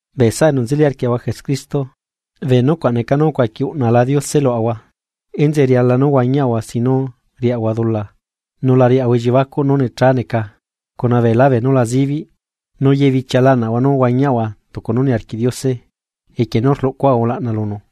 Bee saꞌa enu nzeli arquiaꞌahua Jesucristo bee nucuaꞌ neca nú ucuaqui uꞌnala Diose luaꞌahua, enzeꞌe riala nú huañiaꞌahua sin nú riaꞌahua dula nu la riaꞌahua elliebacuꞌ nú necha neca cuna beela beenu la zibiꞌ nu yebichia laꞌnaꞌahua nú huañiaꞌahua tucu nú niarquiꞌ Diose equie nú rluꞌcuaꞌahua ulaꞌna lunu.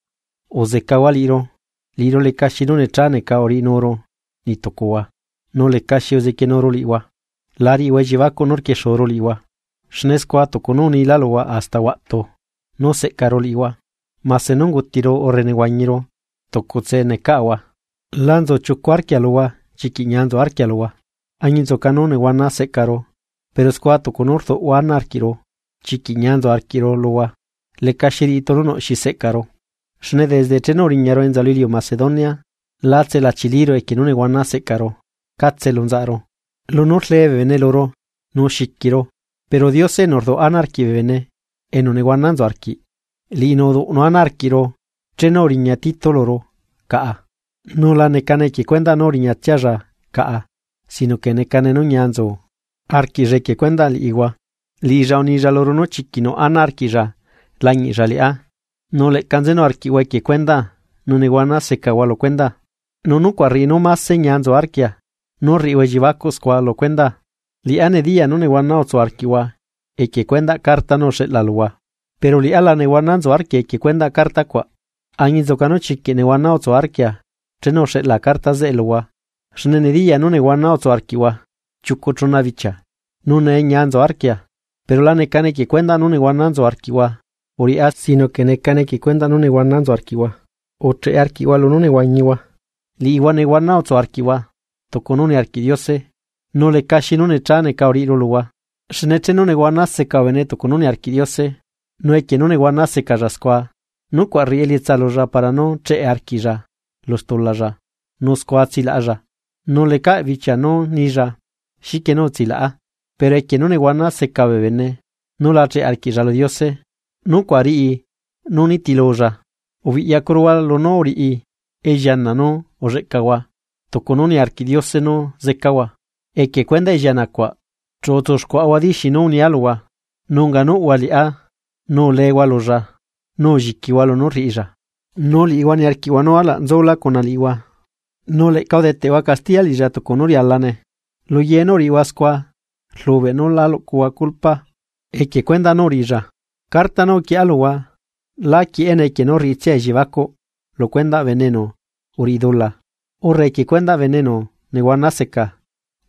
¡Uzecahua liꞌiru! Liꞌiru lecaxi nú necha neca uriꞌinuru niꞌtucuhua nu lecaxi uzequienuru liꞌihua. La riꞌihua elliebacuꞌ nú rquiexuru liꞌihua, xne scua tucu nú unila luhua hasta huaꞌtu nú seꞌcaru liꞌihua, mase nú ungutiru urre nehuañiru tucutse necaꞌahua. La nzu chiucu arquia luhua chiquiꞌ ñia nzu arquia luhua. Añinzuca nú nehuana seꞌcaru, pero scua tucu nú rduꞌhua ana arquiꞌru chiquiꞌ ñia nzu arquiꞌru luhua lecaxi riꞌi tunu nuꞌ xi seꞌcaru. Xne desde chenu uriñaru enza lu iliu Macedonia lá tselachiliru equie nú nehuana seꞌcaru catse elu nzaꞌaru lunú rlee bee bene luru nu xiquiru. Pero Diose enu rduꞌ ana arquiꞌ bene enu nehuana nzu arquiꞌ, liꞌinu uduꞌnu ana arquiꞌru chenu uriña Tito luru caꞌa, nu la necane equie cuendaꞌ nú uriñatsialla caꞌa sino que necane nú ñia nzu arquiꞌlla equie cuendaꞌ liꞌihua. Liꞌilla unilla luru nú chiquiꞌ nuꞌ ana arquiꞌlla lañiꞌlla liꞌá, nu leꞌca nzenu arquiꞌhua equie cuendaa nu nehuana secahua lu cuendaa, nu nucuaꞌ rriꞌi nú máse ñia nzu arquia nú rriꞌihua elliebacuꞌ scua lu cuendaa. Liꞌá nediyaa nú nehuana utsu arquiꞌhua equie cuendaꞌ carta nú uxeꞌla luhua, pero liꞌá la nehuana nzu arquia equie cuendaꞌ carta cuaꞌ. Añinzuca nú chiquiꞌ nehuana utsu arquia chenu uxeꞌla carta zeꞌe luhua xne nediyaa nú nehuana utsu arquiꞌhua chiucu chuna bichia, nu nee ñia nzu arquia, pero la necane equie cuendaꞌ nú nehuana nzu arquiꞌhua uriꞌá sino que necane equie cuendaꞌ nú nehuana nzu arquiꞌhua ucheꞌe arquiꞌhua lunú nehuañihua. Liꞌihua nehuana utsu arquiꞌhua tucu nú niarquiꞌ Diose, nu lecaxi nú necha neca uriꞌiru luhua. Xne chenu nehuana seca bee bene tucu nú niarquiꞌ Diose, nu equie nú nehuana secalla scua, nucuaꞌ rriꞌi elietsa lulla para nú cheꞌe arquiꞌlla lu stulalla nu scua tsilaꞌalla, nu lecaꞌ bichia nú nilla xiquie nú utsilaꞌa, pero equie nú nehuana seca bee bene nu la cheꞌe arquiꞌlla lu Diose, nucuaꞌ riꞌi nú nitilulla. Ubiꞌyacuruhua lunú uriꞌi elliana nú ulleꞌcahua tucu nú niarquiꞌ Diose nú zecahua, equie cuendaꞌ elliana cuaꞌ chu utsuxcuaꞌahua diixi nú unia luhua nu unganuꞌhua liꞌá nu ulehua lulla nu ulliquihua lunú rriꞌilla. Nu liꞌihua niarquiꞌhua nú alaꞌ nzulá cuna liꞌihua, nu leꞌca udeteꞌhua castiya liꞌilla tucu nú rialane, luye nú uriꞌihua, scua rlubeꞌ nú la luꞌcuhua culpa equie cuendaꞌ nú uriꞌilla. Carta nú uquieꞌa luhua, lá quieꞌene equie nú rriꞌitsia elliebacuꞌ lu cuendaꞌ bene enu uriꞌi dula, urre equie cuendaꞌ bene enu nehuana seca,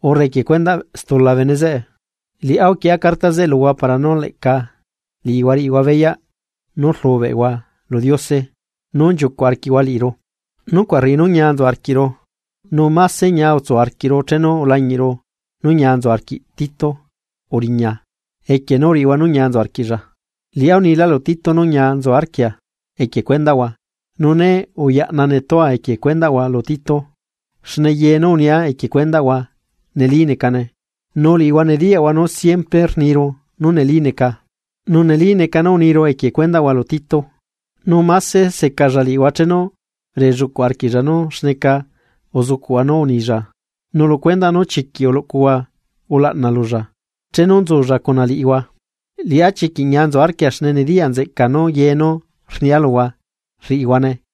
urre equie cuendaꞌ stula bene zeꞌe. Liꞌá uquieꞌa carta zeꞌe luhua para nú leꞌca liꞌihua riꞌihua beyaꞌ nú rlubeꞌhua lu Diose nú nchiucuꞌ arquiꞌhua liꞌiru. Nucuaꞌ rriꞌi nú ñia nzu arquiꞌru, nu máse ñia utsu arquiꞌru chenu ulañiꞌru nú ñia nzu arquiꞌ Tito uriña, equie nú uriꞌihua nú ñia nzu arquiꞌlla. Liꞌá unila lu Tito nú ñia nzu arquia, equie cuendaꞌhua, nu né uyaꞌna netua equie cuendaꞌhua lu Tito. Xne ye nú unia equie cuendaꞌhua neli necane. Nu liꞌihua nediyaꞌhua nú siempre rniru nú neli neca, nu neli neca nú uniru equie cuendaꞌhua lu Tito. Nu máse secalla liꞌihua chenu relluꞌcuꞌ arquiꞌlla nú xneca uzucuꞌhua nú rnilla nu lu cuendaꞌ nú chiquiꞌ uluꞌcuhua ulaꞌna lulla chenu nzulla cuna liꞌihua. Liꞌá chiquiꞌ ñia nzu arquia xne nediya nzeꞌcaa nú ye nú rnia luhua rriꞌihuane.